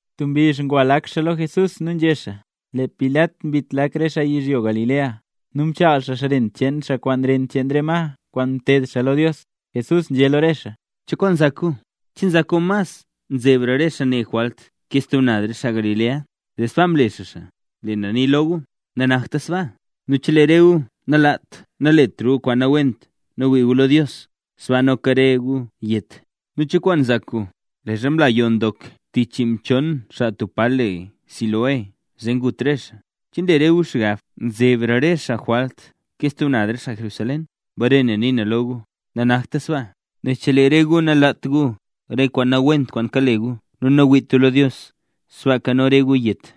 Tub mbizh ngwa lak xaa lo Jesús nu nzhé xaa: —Lee Pilat mbit lak re xaa yizhyo Galilea, nu mchaal xaa ren cheen xaa kwaan ren cheen re ma kwaan mteed xaa lo Dios. Jesús nzhé lo re xaa: —¿Cho kwaan nzak gu? ¿Che nzak gu mas nzebra re xaa ne jwalt ke stub naz re xaa Galilea, zee sbaa mle xaa xaa? Lee na nii lo gu, nanakta sbaa; nu chelee re gu nalaat naletra gu kwaan nawent nu wii gu lo Dios, sbaaka noka re gu yet. Nu, ¿cho kwaan nzak gu? Leezha mla yoo ndok tich chiimchon xaa tub pa le Siloé zee ngut re xaa. ¿Che nle re gu xgab nzebra re xaa jwalt ke stub naz re xaa Jerusalén? Bare na nii na lo gu, nanakta sbaa; nel chelee re gu nalaat gu re kwaan nawent kwaan kale gu nu nawiit gu lo Dios, sbaaka noka re gu yet.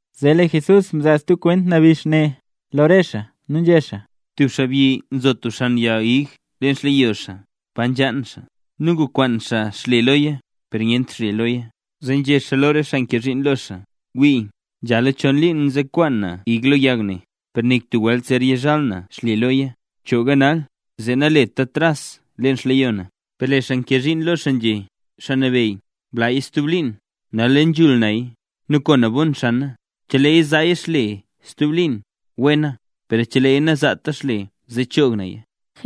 Zee lee Jesús mzaa stub kwent nabix ne lo re xaa nu nzhé xaa: —Tub xaabyi nzo tub xan yag ig leen xleyo xaa pa nzhaan xaa. Nu ngukwaan xaa xle loya, per nyent xle loya. Zee nzhé xaa lo re xaa nkee zhiin lo xaa: “Wii, nzhala chon liin nzekwaan na ig lo yag ne, per nik tub welt zer yizhal na xle loya. Bchooga nal, zee naleta tras leen xleyo na.” Per lee xaa nkee zhiin lo xaa nzhé: “Xaa nabeyy, blaaya stub liin. Nal le nzhul naya nu ko na bon xana, cheleeya zaaya xle stub liin, wena; per cheleeya nazaata xle zee choog naya.”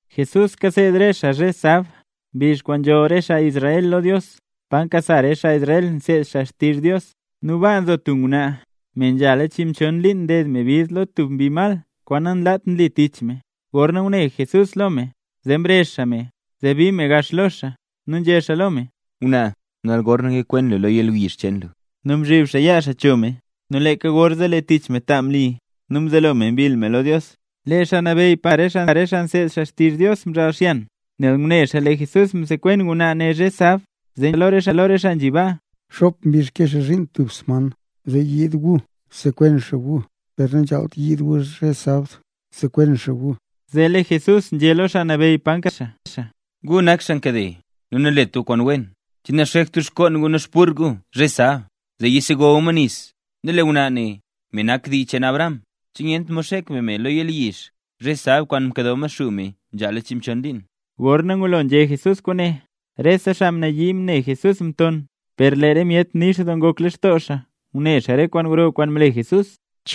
Jesús kaseed re xaa zhe sab, mbizh kwaan nzholl re xaa Israel lo Dios, pa nkasa re xaa Israel nseed xaa xtizh Dios. Nu baa nzo tub ngwnaa, me nzhala chiimchon liin nded me bid lo tub mbi mal kwaan nanlaat nli tich me. Gorna ngune Jesús lo me, zee mrezh xaa me, zee bii me gax lo xaa nu nzhé xaa lo me: —Ngwnaa, nal gorne lee lu yakwen lo yalyizh cheen lu. Nu mzhib xaa yaa xaa cho me, nu leeka gorzee lee tich me ta mli nu mzelo me mbill me lo Dios. Lee xaa nabeyy pa nkasa re xaa nseed xaa xtizh Dios mzhaal xyan, nel ngune xaa lee Jesús msekwen ngwnaa ne zhe sab. Zee nzhé xaa lo re xaa nzhi baa: —Xop mbizh nkee xaa zhiin tub sman, zee yiid gu zee sekwen xaa gu. Per nanzhaalt yiid gu zhe sab, zee sekwen xaa gu. Zee lee Jesús nzhé lo xaa nabeyy pa nkasa re xaa: —¡Gu nak xaa nkade nu nanlet gu kwaan wen! ¿Che nanxekt gu xngoon gu nu xburr gu zhe sab, zee yisego gu ma nis? Nu lee ngwnaa ne, me nak dii cheen Abraham, ¿che nyent mod zhe sab xek be me lo yalyizh kwaan mkado Maxuu me nzhala chiimchon liin? Gorna ngulo nzhé Jesús kwaane, rese xaa mnayii ne Jesús mton, per lee re myet nix doo ngok lextoo xaa ngune xaa re kwaan gro kwaan mle Jesús.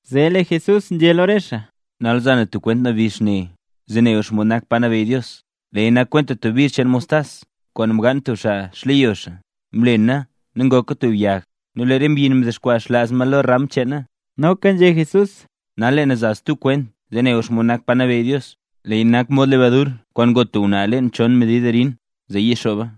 Zee lee Jesús nzhé lo re xaa: —Nal za na stub kwent nabix ne zee ne gu xomod nak pa nabeyy Dios. Leeya nak kwenta tub bizh cheen mostas kwaan mgaan tub xaa xleyo xaa. Mlena nu ngoka tub yag, nu lee re mbyin mdexkwaa xlaaz ma lo re ram cheena. Noka nzhé Jesús: —Nal lee na za stub kwent nabix lo re gu zee ne gu xomod nak pa nabeyy Dios. Leeya nak mod lebadur kwaan ngo tub ngwnaa leen chon medid arin, zee yixooba.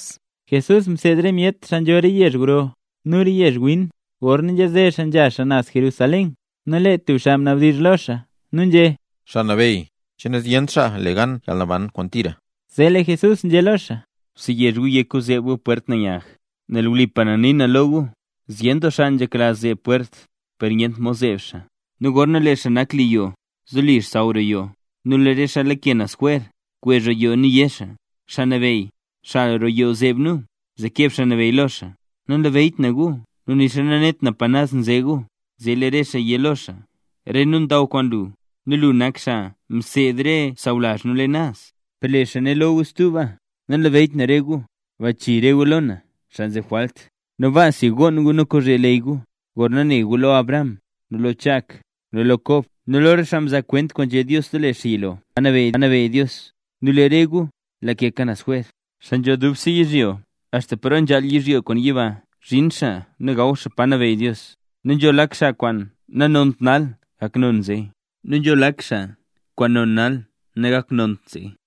Jesús mseed re myet xaa nzho re yezh gro nu re yezh win gorna nzhaze xaa nzha xaa naz Jerusalén. Nu lee tub xaa mnabdizh lo xaa nu nzhé: —Xaa Nabeyy, ¿che nazyent xaa le gan yalnaban kwaan tira? Zee lee Jesús nzhé lo xaa: —Bseyezh gu yek gu zeeb gu pwert nanyag, nel wlipa na nii na lo gu, zyen doo xaa nzhekla zeeb pwert, per nyent mod zeeb xaa. ’Nu gorna lee xaa nak li yoo, zoli saaw roo yoo, lee re xaa lake naz jwer kwezh roo yoo nu yé xaa: “Xaa Nabeyy, xal roo yoo zeeb nu”. Zee keb Xaa Nabeyy lo xaa: “Nanlabeyyt na gu nu nixa nanet pa naz nze gu”. Zee lee re gu yé lo xaa: “Re nu ndaw kwaan lu, nu lu nak xaa mseed re sawlazh nu leen naz”. Per lee xaa né lo gu stuba: “Nanlabeyyt na re gu. Bachii re gu lo na, xaa nzeb jwalt.” Nu baasi, gonn gu nu kozhe leyy gu gorna ne gu lo Abraham, nu lo Chak, nu lo Kob nu lo rese xaa mzaa kwent kwaan nzhé Dios lo lee xaa yilo, pa nabeyy Dios, nu lee re gu lakeka naz jwer. Xaa nzho dubse yizhyo axta paro nzhaal yizhyo kwaan yiba zhin xaa nu gaw xaa pa nabeyy Dios. Nu nzho lak xaa kwaan nanont nal gak non zee; nu nzho lak xaa kwaan non nal nagakt non zee.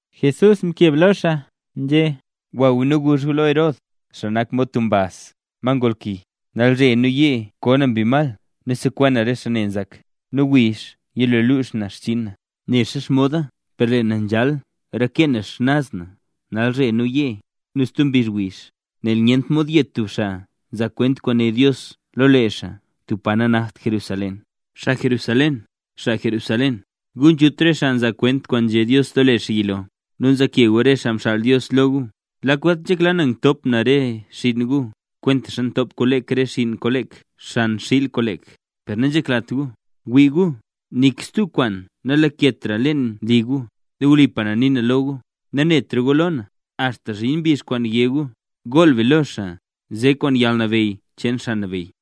Jesús mkeb lo xaa nzhé: —Gwa gu nu guzh gu lo Herod, xaa nak mod tub mbaz, ma ngolki: “Nalzhe nu yee koo na mbi mal nu sekwen na re xaa ne nzak, nu wiizh yilo lux na xchinn na”. Nexa xomoda per lee na nzhaal reke na xnaz na nalzhe nu yee nu stub mbizh wiizh. Nel nyent mod yet tub xaa nzaa kwent kwaan né Dios lo lee xaa tub pa nanakt Jerusalén. ’Xaa Jerusalén, xaa Jerusalén, gu nzhut re xaa nzaa kwent kwaan nzhé Dios lo lee xaa yilo, nu nzaake gu re xaa mxaal Dios lo gu. Lak welt nzhekla na ngtop na re xinn gu, kwentaxa ntop kolek re xinn kolek xan xiil kolek, per nanzheklat gu. Wii gu, nik stub kwaan nalaketra leen li gu. Nu wlipa na nii na lo gu, nanetra gu lo na, axta zhin mbizh kwaan yé gu: “¡Gool be lo xaa nze kwaan yalnabeyy cheen Xaa Nabeyy!”